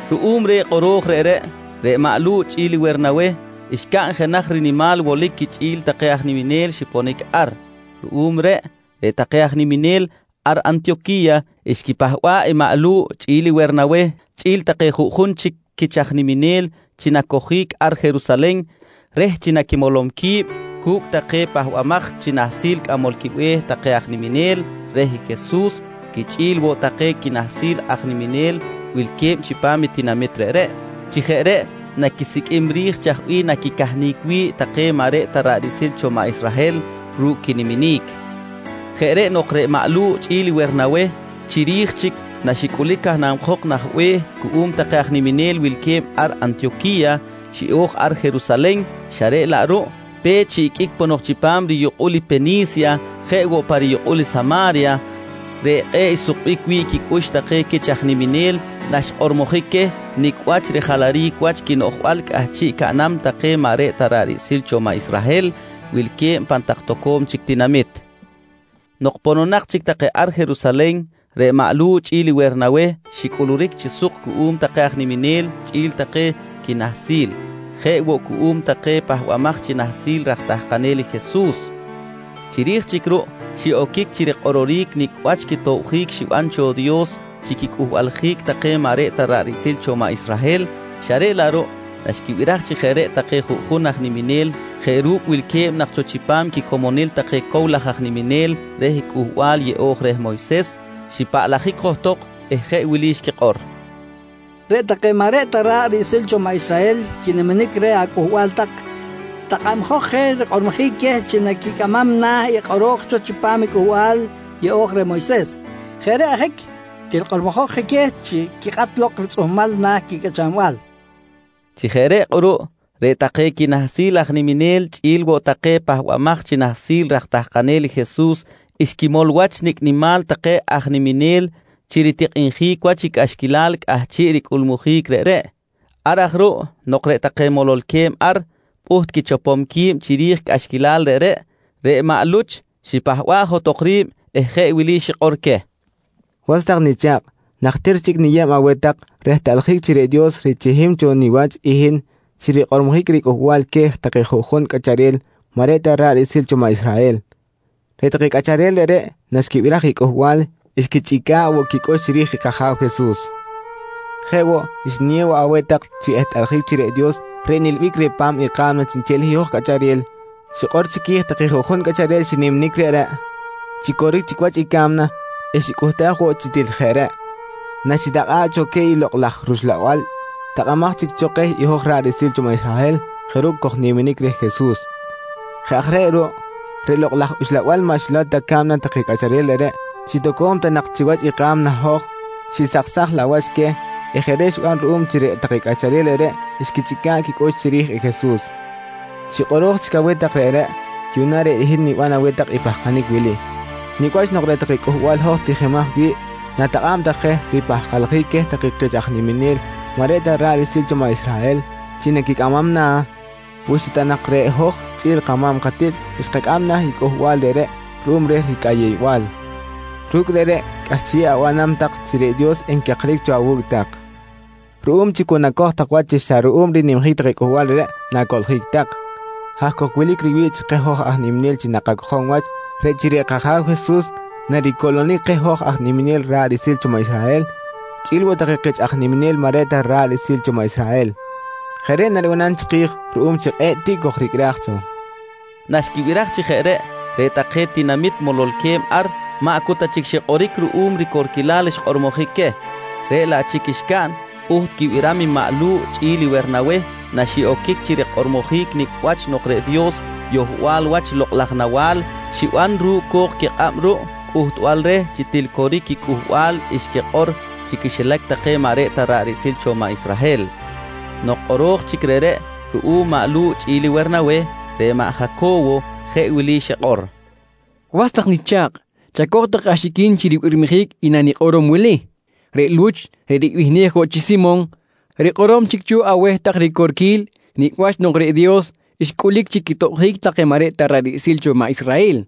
Ruꞌum reh kꞌoro̱j reꞌreꞌ, reꞌ maꞌ Lu̱ꞌ chꞌi̱l Wernaweh xcaꞌn jenaj rinimal wolic quichꞌi̱l take aj niminel xiponic ar. Ruꞌum reꞌ, reꞌ take aj niminel ar Antiyoqui̱ya xquipahba̱ꞌ i maꞌ Lu̱ꞌ chꞌi̱l Wernaweh chꞌi̱l take juꞌjun chic quich aj niminel chi nacojic ar Jerusalen reh chi naquimolom qui̱b cu̱cꞌ take pahbamaj chi nahsil cꞌamol quibe̱h take aj niminel reh i Jesus quichꞌi̱l woꞌ take quinahsil aj niminel wilque̱b chipam i tinamit reꞌreꞌ. Chi jeꞌ reꞌ naquisiqꞌuim ri̱j chaj bih naquicahnic wi̱ꞌ take maꞌ reꞌ ta ra̱ꞌ riꞌsil cho maꞌ Israhel ru̱cꞌ quiniminic. Jeꞌ reꞌ nok reꞌ maꞌ Lu̱ꞌ chꞌi̱l Wernaweh chiri̱j chic naxicꞌulic canabjok nah be̱h cuꞌum take aj niminel wilque̱b ar Antiyoqui̱ya, xiꞌo̱j ar Jerusalen xa reꞌ laꞌ ruꞌ pe̱t xiꞌiqꞌuic ponok chipam riyukꞌul i Peni̱sya jeꞌ woꞌ pa riyukꞌul i Sama̱rya, reꞌ kꞌe̱ꞌ xsukbic wi̱ꞌ quicꞌux take quich aj niminel naxkꞌormojic queh nicꞌ wach rijalaric wach quinoꞌjbal cꞌahchiꞌ caꞌnam take maꞌ reꞌ ta ra̱ꞌ riꞌsil cho maꞌ Israhel wilque̱b pan tak toco̱m chic tinamit. Nok pononak chic take ar Jerusalen, reꞌ maꞌ Lu̱ꞌ chꞌi̱l Wernaweh xicꞌuluric chi suk cuꞌum take aj niminel chꞌi̱l take quinahsil, jeꞌ woꞌ cuꞌum take pahbamaj chi nahsil raj tahkanel i Jesus. Chiri̱j chic ruꞌ xiꞌoquic chi rikꞌororic nicꞌ wach quitobjic xiban cho Dios chi quicꞌuhbaljic take maꞌ reꞌ ta ra̱ꞌ riꞌsil cho maꞌ Israhel xa reꞌ laꞌ ruꞌ naxquibiraj chi jeꞌ reꞌ take juꞌjun aj niminel jeꞌ ru̱cꞌ wilque̱b nak cho chipam quicomonil take cow laj aj niminel reh Cꞌuhbal Yeꞌo̱j reh Moyses, xipaꞌlajic johtok eh jeꞌ wili xquikꞌor: «Reꞌ take maꞌ reꞌ ta ra̱ꞌ riꞌsil cho maꞌ Israhel quiniminic reh acꞌuhbal tak, takꞌabjok je rikꞌormojic queh chi naquicꞌamam na̱ i kꞌoro̱j cho chipam i Cꞌuhbal Yeꞌo̱j reh Moyses. Jeꞌ reꞌ ajic til kꞌormojok je queh chi quikꞌat lok ritzꞌuhmal na̱ quicꞌachanbal, nqui take. Chi jeꞌ reꞌ kꞌuruꞌ reꞌ take quinahsil aj niminel chꞌi̱l woꞌ take pahbamaj chi nahsil raj tahkanel i Jesus xquimol wach nicꞌ nimal take aj niminel chi ritikꞌinjic wach i cꞌaxquilal cꞌahchiꞌ ricꞌulmujic reꞌreꞌ. Ar aj ruꞌ nok reꞌ take mololque̱b ar pꞌuht quichopom qui̱b chiri̱j cꞌaxquilal reꞌreꞌ, reꞌ maꞌ Luch xipahba̱ꞌ johtok ri̱b eh jeꞌ wili xikꞌor queh: «Was tak nicha̱kꞌ, najtir chic niyeb aweh tak rehtꞌaljic chi reꞌ Dios richihim cho niwach i hin chi rikꞌormojic riCꞌuhbal queh take juꞌjun cꞌacharel maꞌ reꞌ ta ra̱ꞌ riꞌsil cho maꞌ Israhel. Reꞌ take cꞌacharel reꞌreꞌ naxquibiraj i cꞌuhbal, xquichꞌica̱ꞌ woꞌ quicꞌux chiri̱j i kAja̱w Jesus. Jeꞌ woꞌ, xniyew woꞌ aweh tak chi ehtꞌaljic chi reꞌ Dios reꞌ nilbic reh pa̱m i ka̱mna chiꞌnchel i hoj cꞌacharel, xikꞌor chiqui̱j take juꞌjun cꞌacharel xiniminic reꞌreꞌ chi coric chic wach i ca̱mna eh xicꞌuhtaj woꞌ chi til jeꞌ reꞌ, naxitakꞌa̱ꞌ cho queh i Lokꞌ laj rUxlabal takꞌamaj chic cho keh hoj ra̱ꞌ riꞌsil cho maꞌ Israhel jeꞌ ru̱cꞌ kojniminic reh Jesus. Jeꞌ aj reꞌ ruꞌ, reꞌ Lokꞌ laj Uxlabal maꞌ xilow ta ca̱mna take cꞌacharel reꞌreꞌ chi toco̱m ta nak chiwach i ka̱mna hoj, xisaksaj laꞌ wach queh eh jeꞌ reꞌ xiban ruꞌum chi reꞌ take cꞌacharel reꞌreꞌ xquichꞌica̱ꞌ quicꞌux chiri̱j i Jesus. Chi kꞌoro̱j chic aweh tak reꞌreꞌ, yuꞌna reꞌ hin niban aweh tak i pahkanic wili: Nicꞌ wach nok reꞌ take cꞌuhbal hoj tijimaj wi̱ꞌ na̱takꞌa̱b tak je ripahkaljic queh take kich aj niminel maꞌ reꞌ ta ra̱ꞌ riꞌsil cho maꞌ Israhel chi naquicꞌamam na̱, wi xa ta nak reꞌ hoj chꞌi̱l kama̱m katiꞌt xkacꞌam na̱ i cꞌuhbal reꞌreꞌ ruꞌum reh ricꞌayew-bal? Ru̱cꞌ reꞌreꞌ cꞌahchiꞌ abanam tak chi reꞌ Dios encakric cho awu̱cꞌ tak ruꞌum chi cu nacoj tak wach chi xa ruꞌum rinimjic take cꞌuhbal reꞌreꞌ na̱coꞌljic tak. Haj cok wilic riwi̱ꞌ chi keh hoj aj niminel chi nakacojom wach, reꞌ chi reꞌ kAja̱w Jesus naricoꞌlonic keh hoj aj niminel ra̱ꞌ riꞌsil cho maꞌ Israhel chꞌi̱l woꞌ take kich aj niminel maꞌ reꞌ ta take ra̱ꞌ riꞌsil cho maꞌ Israhel. Jeꞌ reꞌ naribanam chiki̱j ruꞌum chi kꞌe̱ꞌ tiꞌ kojricꞌraj cho, nqui maꞌ Luch. Naxquibiraj chi jeꞌ reꞌ, reꞌ take tinamit mololque̱b ar, maꞌ cu ta chic xikꞌoric ruꞌum ricorquilal xkꞌormojic queh, reꞌ laꞌ chic xcaꞌn pꞌuht quibiram i maꞌ Lu̱ꞌ chꞌi̱l Wernaweh naxiꞌoquic chi rikꞌormojic nicꞌ wach nok reꞌ Dios yohbal wach lokꞌ laj nawa̱l xiban ru̱cꞌ co̱k quikꞌab ruꞌ cꞌuhtbal reh chi til coric i cꞌuhbal xquikꞌor chi quixilac take maꞌ reꞌ ta ra̱ꞌ riꞌsil cho maꞌ Israhel. Nok kꞌoro̱j chic reꞌreꞌ ruꞌum maꞌ Lu̱ꞌ chꞌi̱l i Wernaweh, reꞌ maꞌ Jaco̱wo jeꞌ wili xikꞌor: «Was tak nicha̱kꞌ, chacoj tak axiquin chi ribirmijic i nanikꞌorom wili: Reꞌ Luch reꞌ ribihnej woꞌ chi Simon, rikꞌorom chic cho aweh tak ricorquil nicꞌ wach nok reꞌ Dios xcꞌulic chi quitobjic take maꞌ reꞌ ta ra̱ꞌ riꞌsil cho maꞌ Israhel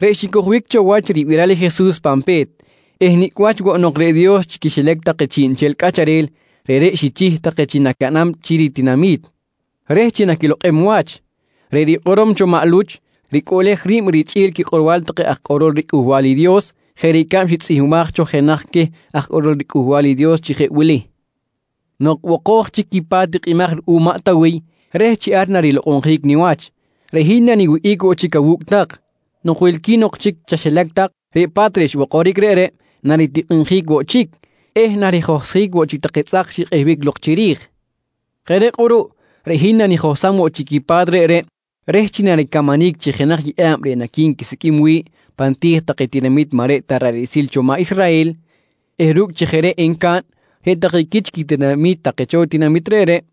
reꞌ xicojbic cho wach ribiral i Jesus pan pe̱t eh nicꞌ wach woꞌ nok reꞌ Dios chi quixilac take chiꞌnchel cꞌacharel reꞌreꞌ xichih take chi nacaꞌnam chi ritinami̱t reh chi naquilokꞌem wach. Reꞌ rikꞌorom cho maꞌ Luch, ricꞌuꞌlej ri̱b richꞌi̱l quikꞌorbal take aj kꞌorol riCꞌuhbal i Dios jeꞌ ricab xitzꞌihmbaj cho jenaj queh aj kꞌorol riCꞌuhbal i Dios chi jeꞌ wili: “Nok bokoj chic i pa̱t tikꞌimaj ruꞌum maꞌ Tawiy reh chi ar narilokꞌonjic niwach, reꞌ hin naniwihꞌic woꞌ chic awu̱cꞌ tak. Nok wilqui̱n ok chic chaxilac tak, reꞌ pa̱t reꞌ xbokoric reꞌreꞌ naritikꞌinjic woꞌ chic eh narijohsjic woꞌ chic take tzꞌak xikꞌehbic lok chiri̱j. Jeꞌ reꞌ kꞌuruꞌ reꞌ hin nanijohsam woꞌ chic i pa̱t reꞌreꞌ reh chi naricamanic chi jenaj yeꞌa̱b reꞌ naqui̱nquisiqꞌuim wi̱ꞌ pan ti̱j take tinamit maꞌ reꞌ ta ra̱ꞌ riꞌsil cho maꞌ Israhel eh ru̱cꞌ chi jeꞌ reꞌ encaꞌn, reꞌ take quich quitinami̱t take cho tinamit reꞌreꞌ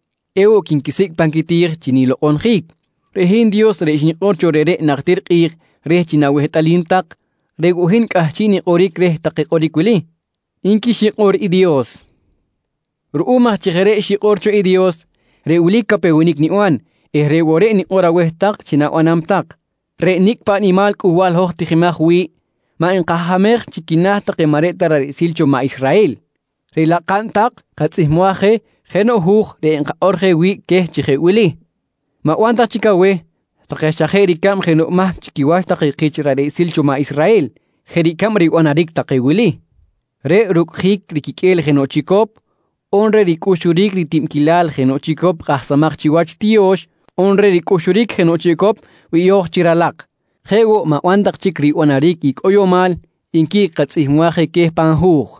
ewoꞌ quinquisicꞌ pan quiti̱j chi nilokꞌonjic. Reꞌ hin Dios reꞌ xnikꞌor cho reꞌreꞌ najtir kꞌi̱j reh chi na̱wehtꞌalim tak, reꞌ woꞌ hin cꞌahchiꞌ nikꞌoric reh take kꞌoric wili, nqui xikꞌor i Dios. «Ruꞌum aj chi jeꞌ reꞌ xikꞌor cho i Dios, reꞌ wili capewenic niban eh reꞌ woꞌ reꞌ nikꞌor aweh tak chi na̱banam tak: Reꞌ nicꞌ paꞌ nimal cꞌuhbal hoj tijimaj wi̱ꞌ, maꞌ nkahamej chi quina̱ take maꞌ reꞌ ta ra̱ꞌ riꞌsil cho maꞌ Israhel, reꞌ laꞌ kaꞌn tak katzꞌihmbaj je jenoꞌ hu̱j reꞌ enkakꞌor je wi̱ꞌ queh chi jeꞌ wili: ‹Ma̱ban tak chic aweh take xa jeꞌ na ricab jenoꞌ mahc chi quiwach take kich ra̱ꞌ riꞌsil cho maꞌ Israhel jeꞌ ricab ribanaric take wili: Reꞌ rucꞌjic riquiqꞌue̱l jenoꞌ chicop, on reꞌ ricꞌuxuric ritibquilal jenoꞌ chicop kꞌahsamaj chiwach tiyo̱x, on reꞌ ricꞌuxuric jenoꞌ chicop biyo̱j chi ralak. Jeꞌ woꞌ ma̱ban tak chic ribanaric i cꞌoyomal, nqui katzꞌihmbaj je queh pan hu̱j.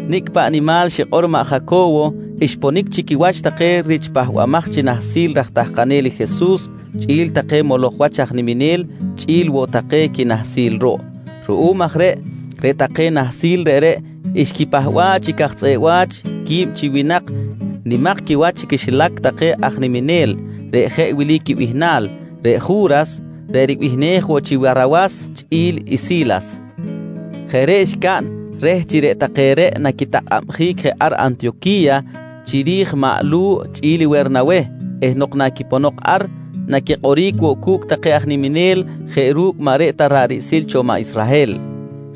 Nicꞌ paꞌ nimal xikꞌor maꞌ Jaco̱wo, xponic chi quiwach take rich pahbamaj chi nahsil raj tahkanel i Jesus chꞌi̱l take moloj wach aj niminel chꞌi̱l woꞌ take quinahsil ruꞌ. Ruꞌum aj reꞌ, reꞌ take nahsil reꞌreꞌ xquipahba̱ꞌ chi caj tzꞌeꞌ wa̱ch quib chi winak nimak quiwach chi quixilac take aj niminel, reꞌ jeꞌ wili quibihnal: Reꞌ Ju̱ras reꞌ ribihnej woꞌ chi Warsawas chꞌi̱l i Si̱las. Jeꞌ reꞌ xcaꞌn reh chi reꞌ take reꞌ naquitakꞌabjic je ar Antiyoqui̱ya chiri̱j maꞌ Lu̱ꞌ chꞌi̱l Wernaweh eh nok na quiponok ar, naquikꞌoric woꞌ cu̱cꞌ take aj niminel jeꞌ ru̱cꞌ maꞌ reꞌ ta ra̱ꞌ riꞌsil cho maꞌ Israhel.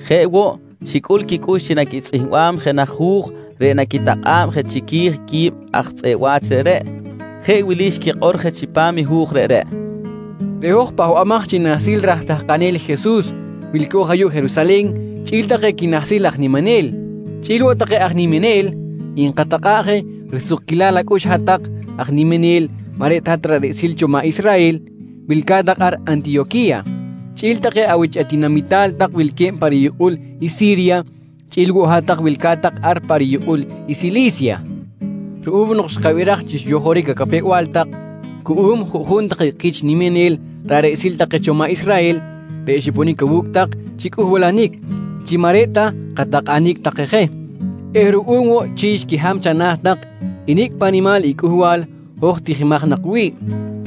Jeꞌ woꞌ, xicꞌul quicꞌux chi naquitzꞌihmbam jenaj hu̱j reꞌ naquitakꞌa̱b je chiqui̱j quib aj tzꞌeꞌ wa̱ch reꞌreꞌ. Jeꞌ wili xquikꞌor je chipam i hu̱j reꞌreꞌ: «Reꞌ hoj pahbamaj chi nahsil raj tahkanel i Jesus wilco̱j ayuꞌ Jerusalen chꞌi̱l take quinahsil aj niminel, chꞌi̱l woꞌ take aj niminel, nkatakꞌa̱ꞌ je risukquilal acꞌux hat-tak aj niminel maꞌ reꞌ ta hat-tak ra̱ꞌ riꞌsil cho maꞌ Israhel wilca̱t tak ar Antiyoqui̱ya chꞌi̱l take awich atinamital tak wilque̱b pa riyukꞌul i Si̱rya chꞌi̱l woꞌ hat-tak wilca̱t tak ar pa riyukꞌul i Sili̱sya. «Ruꞌum nok xkabiraj chi xyojoric acapew-bal tak cuꞌum juꞌjun take kich niminel ra̱ꞌ riꞌsil take cho maꞌ Israhel reꞌ xiponic awu̱cꞌ tak chi cꞌuhbalanic chi maꞌ reꞌ ta katakꞌanic take je eh ruꞌum woꞌ chi xquiham chana̱ tak i nicꞌ paꞌ nimal i cꞌuhbal hoj tijimaj nak wi̱ꞌ,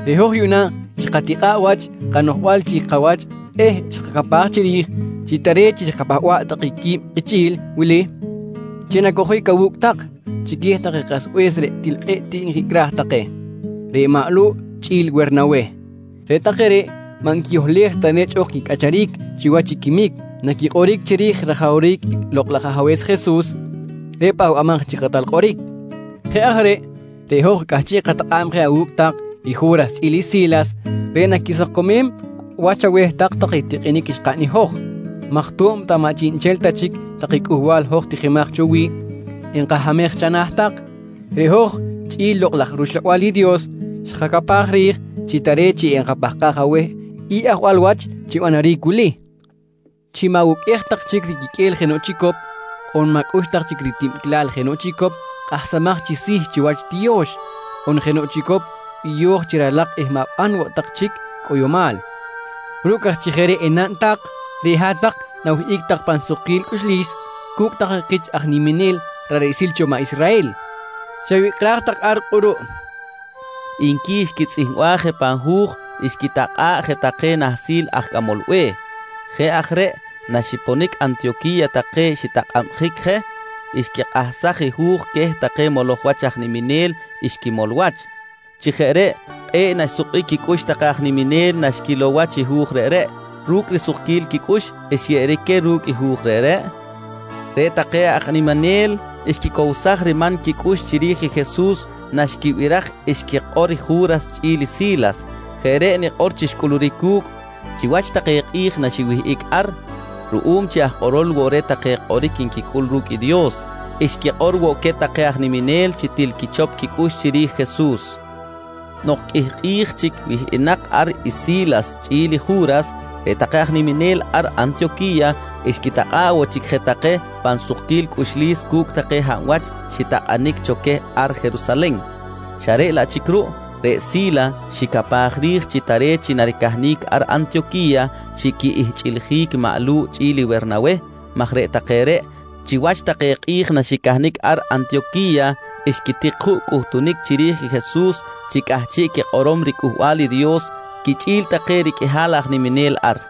reꞌ hoj yuꞌna xkatikꞌa̱ꞌ wach kanoꞌjbal chi kawach eh xkacapaj chiri̱j chi tare̱t chi xkapahba̱ꞌ take qui̱b kichꞌi̱l wili chi nacojic awu̱cꞌ tak chiqui̱j take kasbe̱s reꞌ til kꞌe̱ꞌ tiꞌ nkicꞌraj take, reꞌ maꞌ Lu̱ꞌ chꞌi̱l Wernaweh. Reꞌ take reꞌ maꞌ nquiyohlej ta nechꞌ ok quicꞌacharic chiwach i quimic naquikꞌoric chiri̱j rajawric Lokꞌ laj Ajabe̱s Jesus reꞌ Pahbamaj chi Kꞌatal Kꞌoric. Jeꞌ aj reꞌ, reꞌ hoj cꞌahchiꞌ katakꞌa̱b je awu̱cꞌ tak i Ju̱ras chꞌi̱l i Si̱las reꞌ naquisakomem wach aweh tak take i tikꞌinic xkaꞌn i hoj maj to̱b ta maꞌ chiꞌnchel ta chic take cꞌuhbal hoj tijimaj cho wi̱ꞌ enkahamej chana̱ tak, reꞌ hoj chꞌi̱l Lokꞌ laj rUxlabal i Dios xkacapaj ri̱j chi tare̱t chi enkapahkaj aweh i ajwal wach chi banaric wili: Chi ma̱wuqꞌuej tak chic riquiqꞌue̱l jenoꞌ chicop on ma̱cꞌux tak chic ritibquilal jenoꞌ chicop kꞌahsamaj chi si̱ chiwach tiyo̱x on jenoꞌ chicop biyo̱j chi ralak eh ma̱ban woꞌ tak chic cꞌoyomal. Ru̱cꞌ aj chi jeꞌ reꞌ enaꞌn tak, reꞌ hat-tak na̱wihꞌic tak pan sukquil cꞌuxlis cu̱cꞌ take kich aj niminel ra̱ꞌ riꞌsil cho maꞌ Israhel. «Chawicꞌraj tak ar kꞌuruꞌ, nqui xquitzꞌihmbaj je pan hu̱j xquitakꞌa̱ꞌ je take nahsil aj cꞌamol be̱h. Jeꞌ aj reꞌ naxiponic Antiyoqui̱ya take xitakꞌabjic je, xquikꞌahsaj i hu̱j queh take moloj wach aj niminel xquimol wach. Chi jeꞌ reꞌ kꞌe̱ꞌ naxsukbic quicꞌux take aj niminel naxquilow wach i hu̱j reꞌreꞌ. Ru̱cꞌ risukquil quicꞌux xyeꞌeric queh ru̱cꞌ i hu̱j reꞌreꞌ, reꞌ take aj niminel xquicowsaj riman quicꞌux chiri̱j i Jesus naxquibiraj xquikꞌor i Ju̱ras chꞌi̱l i Si̱las. Jeꞌ reꞌ nikꞌor chi xcꞌuluric cu̱cꞌ maj reꞌ take reꞌ chiwach take kꞌi̱j naxiwihꞌic ar ruꞌum chi aj kꞌorol woꞌ reh take kꞌoric nquicꞌul ru̱cꞌ i Dios, xquikꞌor woꞌ queh take aj niminel chi til quichop quicꞌux chiri̱j Jesus. Nok qꞌuih kꞌi̱j chic quiwihꞌic ar i Si̱las chꞌi̱l i Ju̱ras, reꞌ take aj niminel ar Antiyoqui̱ya xquitakꞌa̱ꞌ woꞌ chic je take pan sukquil cꞌuxlis cu̱cꞌ take hab wach xitakꞌanic cho queh ar Jerusalen xa reꞌ laꞌ chic ruꞌ, reꞌ Si̱las xicapaj ri̱j chi tare̱t chi naricahnic ar Antiyoqui̱ya chi quihchꞌiljic maꞌ Lu̱ꞌ chꞌi̱l i Wernaweh, maj reꞌ take reꞌ chiwach take kꞌi̱j naxicahnic ar Antiyoqui̱ya xquitik juꞌ cꞌuhtunic chiri̱j i Jesus chi cꞌahchiꞌ quikꞌorom riCꞌuhbal i Dios quichꞌi̱l take riqꞌuihal aj niminel ar.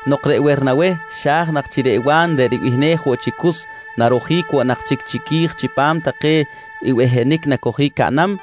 Nok reꞌ Wernaweh xa̱j nak chi reꞌ Wa̱n reꞌ ribihnej woꞌ chi Cus narojic woꞌ nak chic chiqui̱j chipam take behenic nacojic caꞌnam,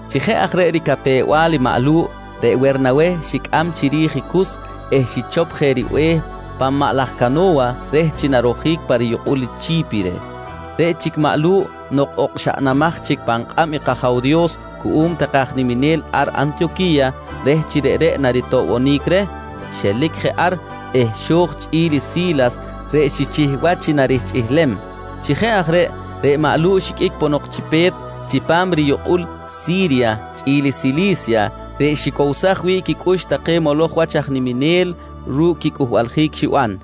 Chi jeꞌ aj reꞌ ricapew-bal i maꞌ Lu̱ꞌ, reꞌ Wernaweh xicꞌam chiri̱j i Cus eh xichop je ribe̱h pan maꞌ laj cano̱wa reh chi narojic pa riyukꞌul i Chi̱pire. Reꞌ chic maꞌ Lu̱ꞌ nok okxaꞌnamaj chic pan kꞌab i kAja̱w Dios cuꞌum take aj niminel ar Antiyoqui̱ya reh chi reꞌreꞌ naritoꞌbonic reh, xelic je ar eh xo̱j chꞌi̱l i Si̱las reꞌ xichih wach chi narihchꞌilem. Chi jeꞌ aj reꞌ, reꞌ maꞌ Lu̱ꞌ xiqꞌuic ponok chi pe̱t chipam riyukꞌul i Si̱rya chꞌi̱l i Sili̱sya reꞌ xicowsaj wi̱ꞌ quicꞌux take moloj wach aj niminel ru̱cꞌ quicꞌuhbaljic xiban.